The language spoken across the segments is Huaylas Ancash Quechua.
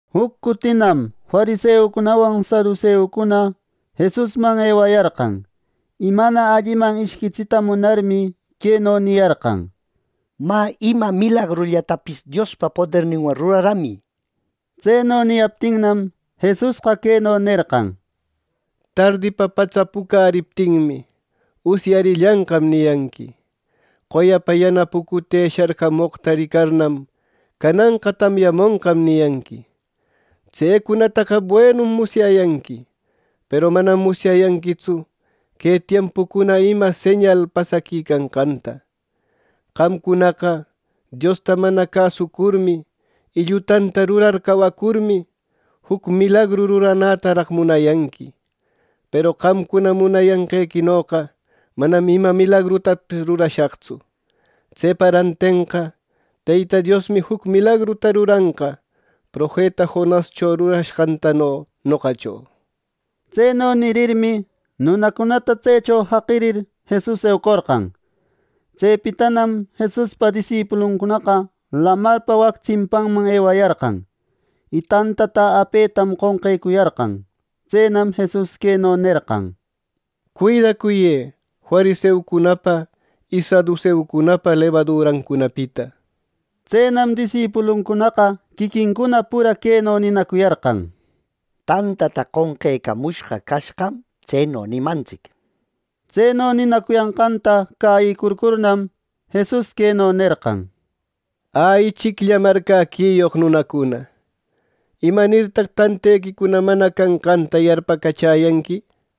Juc cutinam fariseucunawan saduseucuna Jesusman ewayarqan, y mana alliman ishquitsita munarmi, queno niyarqan: —Mä, ima milagrullatapis Diospa poderninwan ruraramï —nir. Tseno niyaptinnam, Jesusqa queno nerqan: —Tardipa patsa pucäriptinmi, ‘Usyarillanqam’ niyanqui; qoyapa yana pucute sharcamoqta ricarnam ‘Cananqa tamyamonqam’ niyanqui. ¡Tsecunataqa buenum musyayanqui! ¡Peru manam musyayanquitsu que tiempucuna ima señal pasaquicanqanta! ¡Qamcunaqa Diosta mana cäsucurmi y llutanta rurar cawacurmi, juc milagru ruranätaraq munayanqui! Peru qamcuna munayanqequinoqa manam ima milagrutapis rurashaqtsu. Tsepa rantenqa Teyta Diosmi juc milagruta ruranqa profeta Jonascho ruranqantano noqacho. Tseno nirirmi, nunacunata tsecho jaqirir, Jesus eucorqan. Tsepitanam Jesuspa disipuluncunaqa lamarpa wac tsimpanman ewayarqan; y tantata apetam qonqecuyarqan. Tsenam Jesus queno nerqan: —Cuidacuyë fariseucunapa y saduseucunapa lebadurancunapita —nir. Tsenam disipuluncunaqa quiquincuna pura queno ninacuyarqan: —Tantata qonqecamushqa cashqam tseno nimantsic —nir. Tseno ninacuyanqanta cäyicurcurnam, Jesus queno nerqan: —Ä, ichiclla marcäquiyoq nunacuna. ¿Imanirtaq tantequicuna mana canqanta yarpacachäyanqui!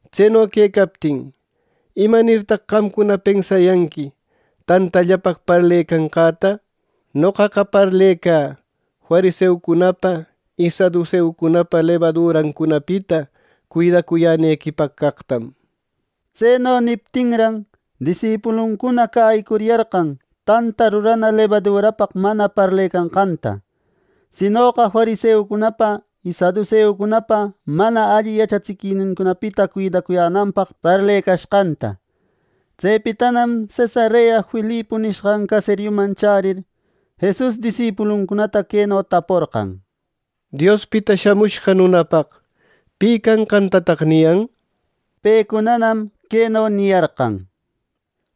Tseno quecaptin, ¿imanirtaq qamcuna pensayanqui tantallapaq parlecanqäta! Noqaqa parlecä fariseucunapa y saduseucunapa lebadurancunapita cuidacuyänequipaq caqtam —nir. Tseno niptinran, disipuluncuna cäyicuriyarqan tanta rurana lebadurapaq mana parlecanqanta; sinoqa fariseucunapa y saduseucunapa mana alli yachatsiquinincunapita cuidacuyänanpaq parlecashqanta. Tsepitanam Cesarea Filipo nishqan caseriucunaman chärir, Jesus disipuluncunata queno taporqan: —Diospita Shamushqa Nunapaq, ¿pi canqantataq niyan? —nir. Pecunanam queno niyarqan: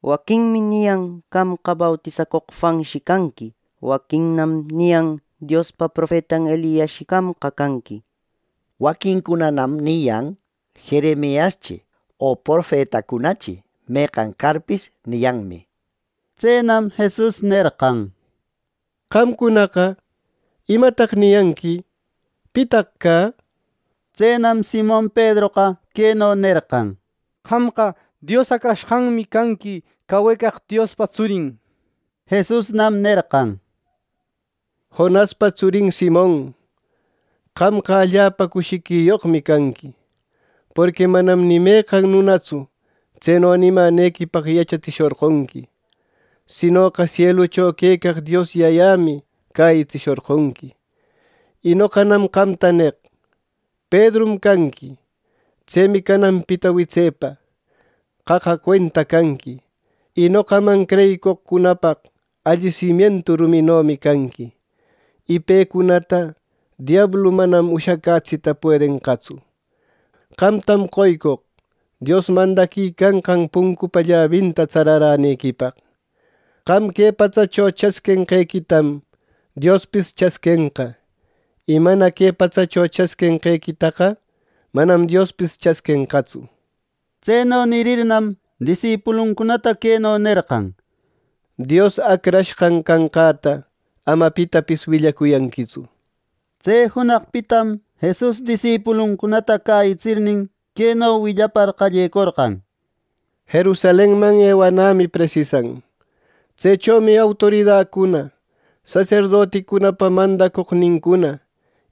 —Waquinmi niyan qamqa bautisacoq Juanshi canqui. Waquinnam niyan Diospa profetan Eliasshi qamqa canqui. Waquincunanam niyan ‘Jeremiaschi o profetacunachi meqan carpis’ niyanmi —nir. Tsenam Jesus nerqan: —Qamcunaqa, ¿imataq niyanqui? ¿Pitaq cä? Tsenam Simon Pedroqa queno nerqan: —¡Qamqa Dios Acrashqanmi canqui, cawecaq Diospa tsurin! —nishpa. Jesusnam nerqan: —Jonaspa tsurin Simon, ¡qamqa allapa cushiquiyoqmi canqui! Porqui manam ni meqan nunatsu tseno nimänequipaq yachatsishorqonqui; sinoqa sielucho quecaq Dios Yayämi cäyitsishorqonqui, y noqanam qamta neq: Pedrum canqui. Tsemi cananpita witsepa: Qaqa cuenta canqui, y noqaman creyicoqcunapaq alli simientu ruminomi canqui, y pecunata diablu manam ushacätsita puedenqatsu. Qamtam qoycoq Dios mandaquicanqan puncupa llabinta tsararänequipaq. Qam que patsacho chasquinqequitam Diospis chasquenqa; y mana que patsacho chasquinqequitaqa manam Diospis chasquenqatsu —nir. Tseno nirirnam, disipuluncunata queno nerqan: —Dios Acrashqan canqäta ama pitapis willacuyanquitsu —nir. Tse junaqpitam Jesus disipuluncunata cäyitsirnin, queno willapar qallecorqan: —Jerusalenman ewanämi presisan. Tsechomi autoridacuna, saserdoticunapa mandacoqnincuna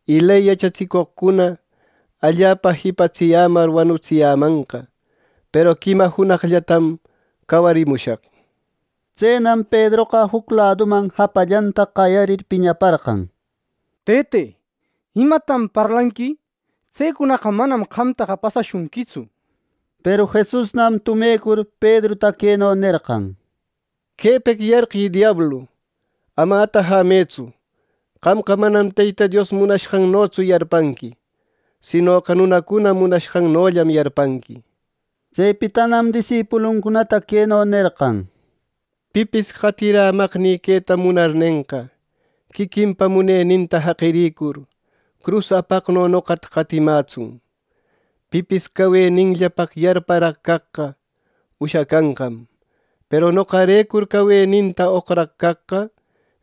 y ley yachatsicoqcuna allapa jipatsiyämar wanutsiyämanqa; peru quima junaqllatam cawarimushaq —nir. Tsenam Pedroqa juc laduman japallanta qayarir piñaparqan: —Tëte, ¿imatam parlanqui! ¡Tsecunaqa manam qamta pasashunquitsu! —nir. Peru Jesusnam tumecur Pedruta queno nerqan: —¡Quepeq yarqï, diablu! ¡Ama atajämëtsu! ¡Qamqa manam Teyta Dios munashqannotsu yarpanqui; sinoqa nunacuna munashqannollam yarpanqui! —nir. Tsepitanam disipuluncunata queno nerqan: —Pipis qatirämaqnï queta munarnenqa, quiquinpa muneninta jaqiricur, crus apaqno noqata qatimätsun. Pipis caweninllapaq yarparaq caqqa ushacanqam; peru noqarecur caweninta oqraq caqqa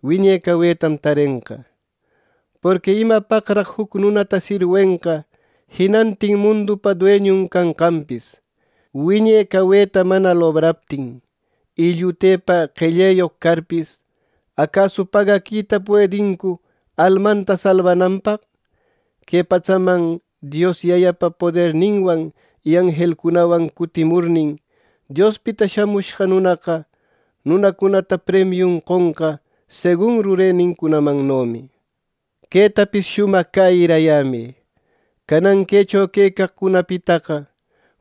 wiñe cawetam tarenqa. Porqui ¿imapaqraq juc nunata sirwenqa jinantin mundupa dueñun canqanpis, wiñe caweta mana lobraptin! Y llutepa qelleyoq carpis, ¿acasu pagaquita puedincu almanta salbananpaq! Que patsaman Dios Yayapa poderninwan y anjelnincunawan cutimurnin, Diospita Shamushqa Nunaqa, nunacunata premiun qonqa segun rurenincunamannomi. Quetapis shumaq cäyirayämë: Canan quecho quecaqcunapitaqa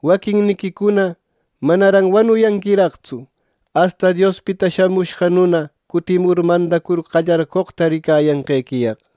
waquinniquicuna manaran wanuyanquiraqtsu, asta Diospita Shamushqa Nuna cutimur mandacur qallarcoqta ricayanqequiyaq.